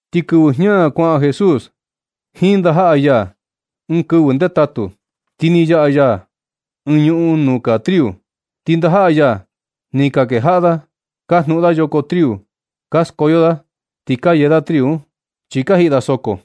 Ti kɨvɨ jña kuaꞌan Jesús jiin ndajaꞌa ya, ɨɨn kɨvɨ ndetatu, ti ni yaꞌa ya ɨɨn ñuꞌun nuu kaa triu. Ti ndajaꞌa ya, ni ka kejaꞌa da ka jnuꞌun da yoko triu. Ka skoyo da ti ka yee da triu un, chi ka jiꞌi da soko.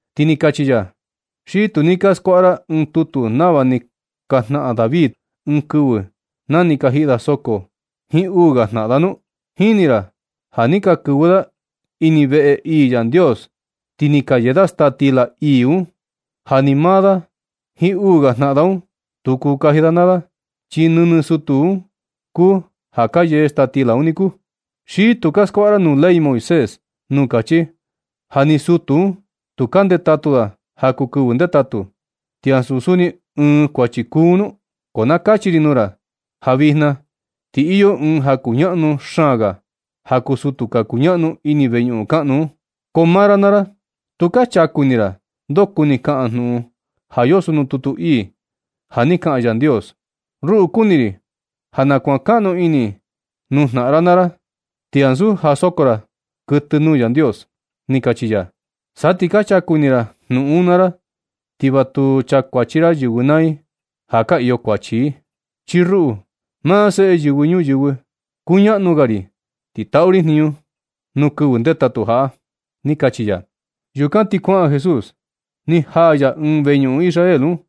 Ti ni kachi ya: ―¿Xi tu ni ka skuaꞌa ra ɨɨn tutu nava ni ka jnaꞌan David ɨɨn kɨvɨ na ni ka jiꞌi da soko, jiin uu ga jnaꞌan da nu? Jini ra ja ni ka kɨvɨ da ini veꞌe ii Yandios, ti ni ka yee da staa stila ii un, ja ni maa da jiin uu ga jnaꞌan da un, tu kuu kaji da naa da, chi nɨnɨ sutu un kuu ja ka yee staa stila un niku. ¿Xi tu ka skuaꞌa ra nuu ley Moisés, nuu kachi ja ni sutu un, tu ka ndetatu da ja kuu kɨvɨ ndetatu, ti ansu suni ɨɨn kuachi kuu un nu? Ko na kachi ri nuu ra, ja vijna ti iyo ɨɨn ja kuñaꞌnu xaan ga ja kuu sutu ka kuñaꞌnu ini veñuꞌun kaꞌnu un. Ko maa ra naa ra, tu ka chaku ini ra ndoo kuni kaꞌan junuꞌun ja yoso nuu tutu ii, ja ni kaꞌan Yandios: “Ruꞌu, kuni ri ja na kuankaꞌnu ini nuu jnaꞌan ra naa ra, ti ansu ja ka soko ra kɨtɨ nuu Yandios”, ni kachi ya. Sa ti ka chaku ini ra jnuꞌun un naa ra, ti va tu chakuachi ra yɨvɨ naa i ja ka iyo falta i. Chi ruꞌu, maa Seꞌe Yɨvɨ Ñuyɨvɨ, kuñaꞌnu ga ri, ti taꞌu ri jniñu nuu kɨvɨ ndetatu jaꞌa ―ni kachi ya. Yukan ti na kuaꞌan Jesús, ni jaa ya ɨɨn veñuꞌun Israel un.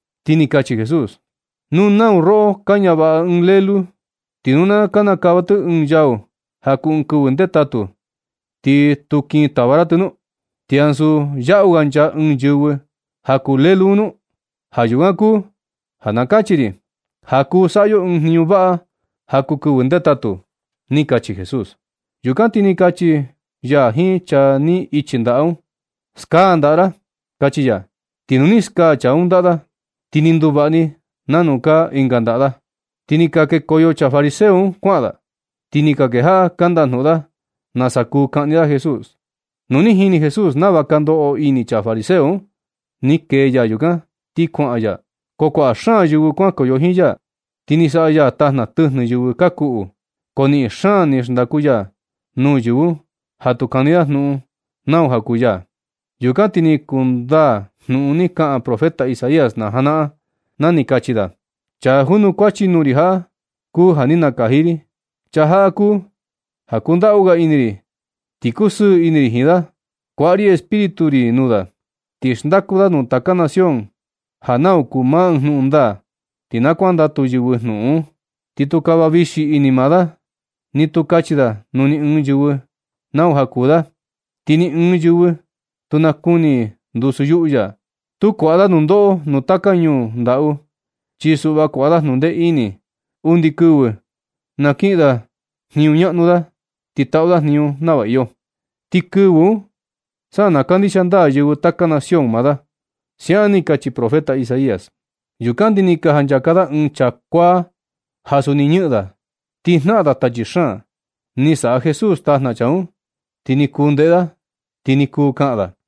Ti ni kachi Jesús: ―Nu nau roꞌo ka ñavaꞌa ɨɨn lélú, ti nu na kinikava tɨ ɨɨn yau ja kuu ɨɨn kɨvɨ ndetatu, ¿ti tu kin tava ra tɨ nu? ¿Ti ansu yaꞌu ga nchaa ɨɨn yɨvɨ ja kuu lélú un nu? Ja yukan kuu ja na kachi ri ja kuu saꞌa yo ɨɨn jniñu vaꞌa ja kuu kɨvɨ ndetatu ―ni kachi Jesús. Yukan ti ni kachi ya jiin chaa ni ichi ndaꞌa un: ―Skaa ndaꞌa ra ―kachi ya. Ti nu ni skaa chaa un ndaꞌa da, ti ni nduvaꞌa ni nanu kaa ndaꞌa da. Ti ni ka kekoyo chaa fariseo un kuaꞌan da, ti ni ka kejaꞌa ka ndajnuꞌun da nasa kuu kaꞌni da Jesús. Nu ni jini Jesús nava ka ndoꞌo ini chaa fariseo un, ni kee ya yukan ti kuaꞌan ya. Ko kuaꞌa xaan yɨvɨ kuankoyo jiin ya, ti ni saꞌa ya tajna tɨjnɨ yɨvɨ ka kuꞌu. Ko niꞌin xaan ni xndaku ya nuu yɨvɨ un ja tu kani da jnuꞌun nau ja kuu ya. Yukan ti ni kundaa jnuꞌun ni kaꞌan profeta Isaías na janaꞌan, na ni kachi da: Chaa junukuachi nuu ri jaꞌa, kuu ja ni nakaji ri. Chaa jaꞌa kuu ja kundaꞌu ga ini ri, ti kusɨɨ ini ri jiin da. Kuaꞌa ri Espíritu ri nuu da, ti xndaku da nuu taka nación ja nau kuu maa jnuꞌun ndaa, ti na kuandatu yɨvɨ jnuꞌun un. Ni tu kava vixi ini maa da, ni tu kachi da nuu ni ɨɨn yɨvɨ nau ja kuu da. Ti ni ɨɨn yɨvɨ tu nakuni i ndusu yuꞌu ya. Tu kuaꞌa da nundoꞌo nuu taka ñuu ndaꞌu, chi suꞌva kuaꞌa da jnundee ini undi kɨvɨ na kiꞌin da jniñu ñaꞌnu da, ti taꞌu da jniñu nava iyo. Ti kɨvɨ un sa na kandixia ndaa yɨvɨ taka nación maa da. Siaꞌan ni kachi profeta Isaías. Yukan ti ni ka janchaka da ɨɨn chaa kuaa ja suni ñɨꞌɨn da, ti jnaꞌan da tachi xaan. Ni saꞌa Jesús tajna chaa un, ti ni kuu ndeꞌe da, ti ni kuu kaꞌan da.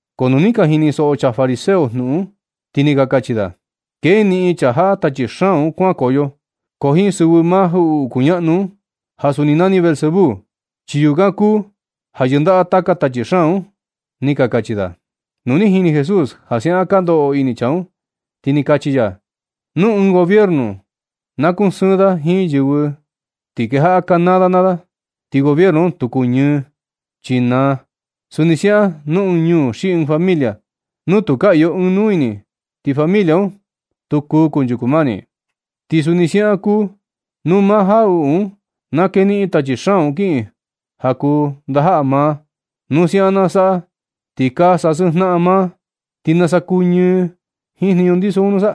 Ko nu ni ka jinisoꞌo chaa fariseo jnuꞌun un, ti ni ka kachi da: ―Keniꞌin chaa jaꞌa tachi xaan un kuankoyo, ko jiin sɨvɨ maa jaꞌuꞌu kuñaꞌnu un (ja suni nani Beelzebú), chi yukan kuu ja yɨndaꞌa taka tachi xaan un ―ni ka kachi da. Nu ni jini Jesús ja siaꞌan ka ndoꞌo ini chaa un, ti ni kachi ya: ―Nu ɨɨn gobiernu, na kusɨɨn da jiin yɨvɨ da ti kejaꞌa kanaa da naa da, ti gobiernu un tu kuñɨɨ, chi naa. Suni siaꞌan nuu ɨɨn ñuu xi ɨɨn familia, nu tu ka iyo ɨɨn nuu ini, ti familia un, tu kuu kunchuku mani. Ti suni siaꞌan kuu nu maa jaꞌuꞌu un na keniꞌin tachi xaan un kiꞌin ja kuu ndajaꞌa maa. Nu siaꞌan na saꞌa, ti ka sasɨɨn jnaꞌan maa, ¿ti nasa kuñɨɨ jiin jniñu ndiso un nusa?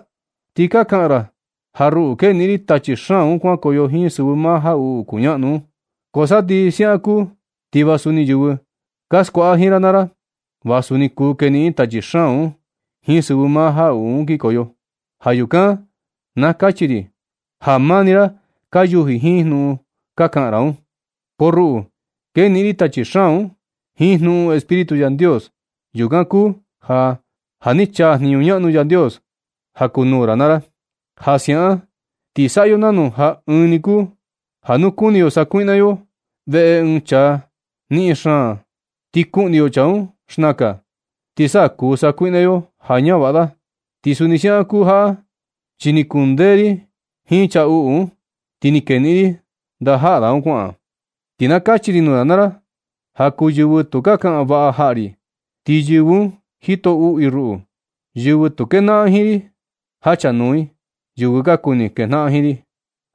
Ti ka kaꞌan ra ja ruꞌu keniꞌin ri tachi xaan un kuankoyo jiin sɨvɨ maa jaꞌuꞌu kuñaꞌnu un. Ko sa ti siaꞌan kuu, ti va suni yɨvɨ ka skuaꞌa jiin ra naa ra, va suni kuu keniꞌin i tachi xaan un jiin sɨvɨ maa jaꞌuꞌu un kinkoyo. Ja yukan na kachi ri ja maa ni ra ka yuji jiin jnuꞌun ka kaꞌan ra un. Ko ruꞌu keniꞌin ri tachi xaan un jiin jnuꞌun Espíritu Yandios. Yukan kuu ja, ja ni chaa jniñu ñaꞌnu Yandios ja kuu nuu ra naa ra. Ja siaꞌan, ti saꞌa yo nanu ja ɨɨn ni kuu ja nu kuni yo sakuiꞌna yo veꞌe ɨɨn chaa niꞌin xaan da, ti kuꞌni yo chaa un xnakan, ti sa kuu sakuiꞌna yo ja ñavaꞌa da. Ti suni siaꞌan kuu jaꞌa chi ni kundee ri jiin chaa uꞌu un, ti ni keniꞌin ri ndajaꞌa da un kuaꞌan. Ti na kachi ri nuu ra naa ra ja kuu yɨvɨ tu ka kaꞌan vaꞌa jaꞌa ri, ti yɨvɨ un jito uꞌu i ruꞌu. Yɨvɨ tu kejnaꞌan jiin ri, jachanuu i yɨvɨ ka kuni kejnaꞌan jiin ri.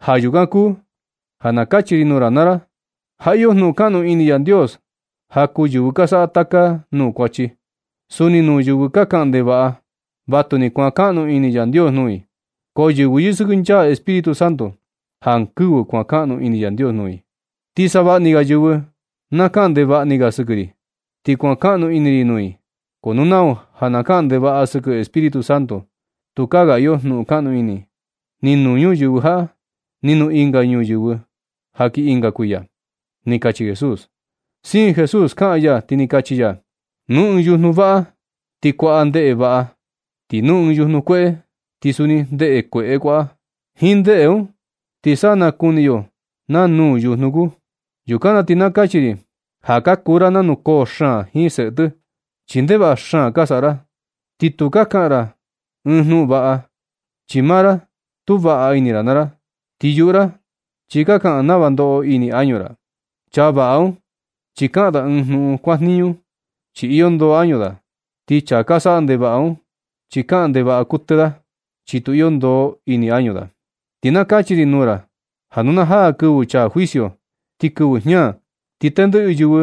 Ja yukan kuu ja na kachi ri nuu ra naa ra ja iyo jnuꞌun kaꞌnu ini Yandios ja kuu yɨvɨ ka saꞌa taka nuu kuachi. Suni nuu yɨvɨ ka kaꞌan ndevaꞌa, vatu ni kuankaꞌnu ini Yandios nuu i. Ko yɨvɨ yɨsɨkɨnchaa Espíritu Santo, jankɨvɨ kuankaꞌnu ini Yandios nuu i. Ti savaꞌa ni ga yɨvɨ na kaꞌan ndevaꞌa ni ga sɨkɨ ri, ti kuankaꞌnu ini ri nuu i. Ko nu nau ja na kaꞌan ndevaꞌa sɨkɨ Espíritu Santo, tukaa ga iyo jnuꞌun kaꞌnu ini, ni nuu ñuyɨvɨ jaꞌa ni nuu ɨnga ñuyɨvɨ ja kii ɨnga kuiya ―ni kachi Jesús. Siin Jesús kaꞌan ya, ti ni kachi ya: ―Nu ɨɨn yujnu vaꞌa, ti kuaꞌa ndeꞌe vaꞌa. Ti nu ɨɨn yujnu kueꞌe kuu, ti suni ndeꞌe kueꞌe kuaꞌa. Jiin ndeꞌe un, ti sa nakuni yo naa nuu yujnu kuu. Yukan na kachi ri ja ka kuu ra nanu koo xaan jiin seꞌe tɨ, chi ndevaꞌa xaan ka saꞌa ra. Ti tu kuu kaꞌan ra ɨɨn jnuꞌun vaꞌa, chi maa ra tu vaꞌa ini ra naa ra. Ti yuꞌu ra chi ka kaꞌan nava ndoꞌo ini añu ra. Chaa vaꞌa un chi kaꞌan da ɨɨn jnuꞌun kuajniñu, chi iyo ndoo añu da. Ti chaa ka saꞌa ndevaꞌa un, chi kaꞌan ndevaꞌa kuɨtɨ da, chi tu iyo ndoo ini añu da. Ti na kachi ri nuu ra ja nu na jaa kɨvɨ chaa juicio, ti kɨvɨ jña, ti tendɨꞌɨ yɨvɨ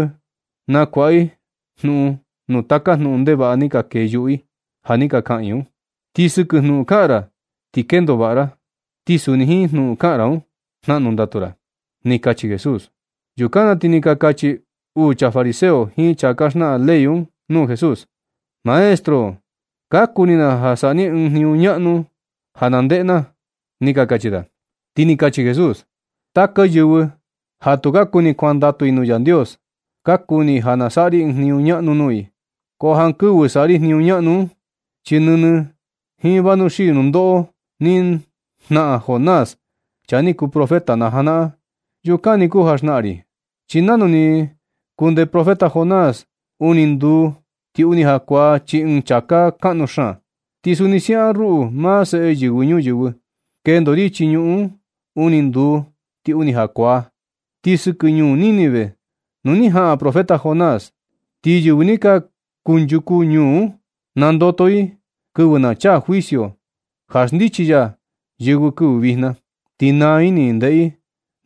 nakuaꞌa i jnuꞌun nuu taka jnuꞌun ndevaꞌa ni kee yuꞌu i ja ni ka kaꞌan i un. Ti sɨkɨ jnuꞌun kaꞌan ra, ti kendo vaꞌa ra. Ti suni jiin jnuꞌun kaꞌan ra un, jnaꞌnu ndatu ra ―ni kachi Jesús. Yukan na ti ni ka kachi uu chaa fariseo jiin chaa ka xnaꞌan ley un nuu Jesús: ―Maestro, ka kuni na ja saꞌa ni ɨɨn jniñu ñaꞌnu ja na ndeꞌe na ―ni ka kachi da. Ti ni kachi Jesús: ―Taka yɨvɨ ja tu ka kuni kuandatu i nuu Yandios, ka kuni i ja na saꞌa ri ɨɨn jniñu ñaꞌnu nuu i, ko jankɨvɨ saꞌa ri jniñu ñaꞌnu un, chi nɨnɨ jiin vanuxii nundoꞌo ni jnaꞌan Jonás, chaa ni kuu profeta na janaꞌan, yukan ni kuu ja xnaꞌan ri. Chi nanu ni kundee profeta Jonás uni nduu ti uni jakuaa chii ɨɨn chāká kaꞌnu xaan, ti suni siaꞌan ruꞌu, maa Seꞌe Yɨvɨ Ñuyɨvɨ, kendo ri chii ñuꞌun un uni nduu ti uni jakuaa. Ti sɨkɨ ñuu Nínive nuu ni jaꞌan profeta Jonás, ti yɨvɨ ni kunchuku ñuu un, nandoto i kɨvɨ na chaa juicio ja xndichi ya yɨvɨ kɨvɨ vijna, ti naa ini i ndeꞌe i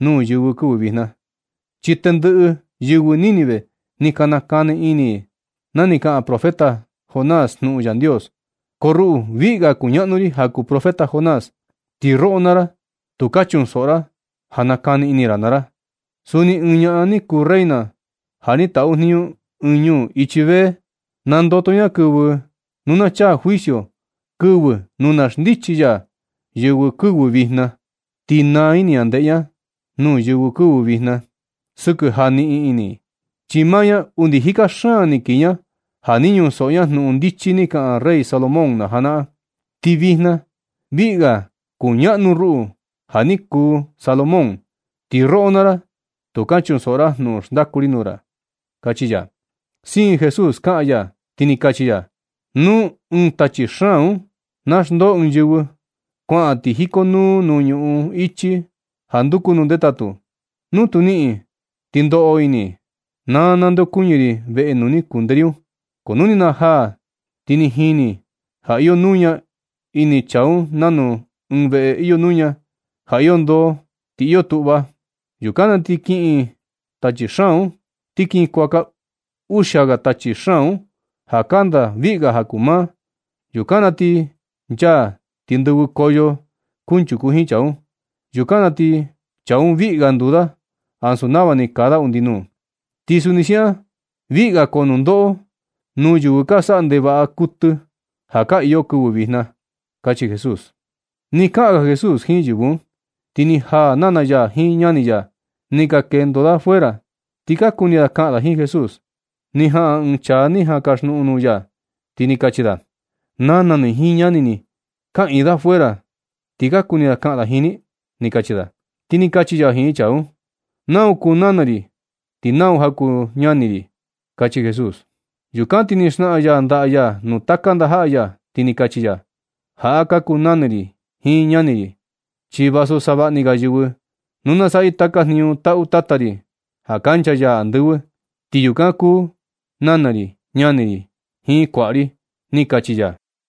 nuu yɨvɨ kɨvɨ vijna. Chi tendɨꞌɨ yɨvɨ Nínive ni ka nakani ini i na ni kaꞌan profeta Jonás jnuꞌun Yandios. Ko ruꞌu viꞌi ga kuñaꞌnu ri ja kuu Jonás, ti roꞌo naa ra tu ka chunsoꞌo ra ja nakani ini ra naa ra. Suni ɨɨn ñaꞌan ni kuu reina ja ni taꞌu jniñu ɨɨn ñuu ichi sur, nandoto ña kɨvɨ nu na chaa juicio, kɨvɨ nu na xndichi ya yɨvɨ kɨvɨ vijna. Ti naa ini ña ndeꞌe ña nuu yɨvɨ kɨvɨ vijna sɨkɨ ja niꞌin ini i, chi maa ña undi jika xaan ni kii ña ja ni ñunsoꞌo ña jnuꞌun ndichi ni kaꞌan rey Salomón na janaꞌan. Ti vijna viꞌi ga kuñaꞌnu ruꞌu ja ni kuu Salomón, ti roꞌo naa ra tu ka chunsoꞌo ra jnuꞌun xndaku ri nuu ra ―kachi ya. Siin Jesús kaꞌan ya, ti ni kachi ya: ―Nu ɨɨn tachi xaan un na xndoo ɨɨn yɨvɨ, kuaꞌan ti jikonuu nuu ñuꞌun ichi ja nduku nuu ndetatu. Nu tu niꞌin ti ndoꞌo ini: “Na nandeokuñɨ ri veꞌe nuu ni kundee ri un.” Ko nu ni najaa, ti jini ja iyo nuña ini chaa un nanu ɨɨn veꞌe iyo nuña, ja iyo ndoo, ti iyo tuꞌva. Yukan na ti kiꞌin tachi un ti kin kuaka uxia ga tachi xaan un ja kanda viꞌi ga ja kuu maa. Yukan na ti nchaa ti ndɨvɨkoyo kunchuku jiin chaa un. Yukan na ti chaa un viꞌi ga nduu da ansu nava ni kaa da undi nuu. Ti suni siaꞌan viꞌi ga koo nundoꞌo nuu yɨvɨ ka saꞌa ndevaꞌa kuɨtɨ ja ka iyo kɨvɨ vijna ―kachi Jesús. Nɨ kaꞌan ga Jesús jiin yɨvɨ un, ti ni jaa nana ya jiin ñani ya, ni ka kendo da fuera ti ka kuni da kaꞌan da jiin Jesús. Ni jaꞌan ɨɨn chaa ni jan kaxjnuꞌun nuu ya, ti ni kachi da: ―Nana ni jiin ñani ni kaꞌiin da fuera un, ti ka kuni kaꞌan da jiin ni ―ni kachi da. Ti ni kachi ya jiin chaa un: ―Nau kuu nana ri ti nau ja kuu ñani ri ―kachi Jesús. Yukan ti ni xnaꞌan ya ndaꞌa ya nuu taka ndajaꞌa ya, ti ni kachi ya: ―Jaꞌa ka kuu nana ri jiin ñani ri. Chi vasu savaꞌa ni ga yɨvɨ nu na saꞌa i taka jniñu taꞌu Tata ri ja kancha ya andɨvɨ, ti yukan kuu nana ri, ñani ri jiin kuaꞌa ri ―ni kachi ya.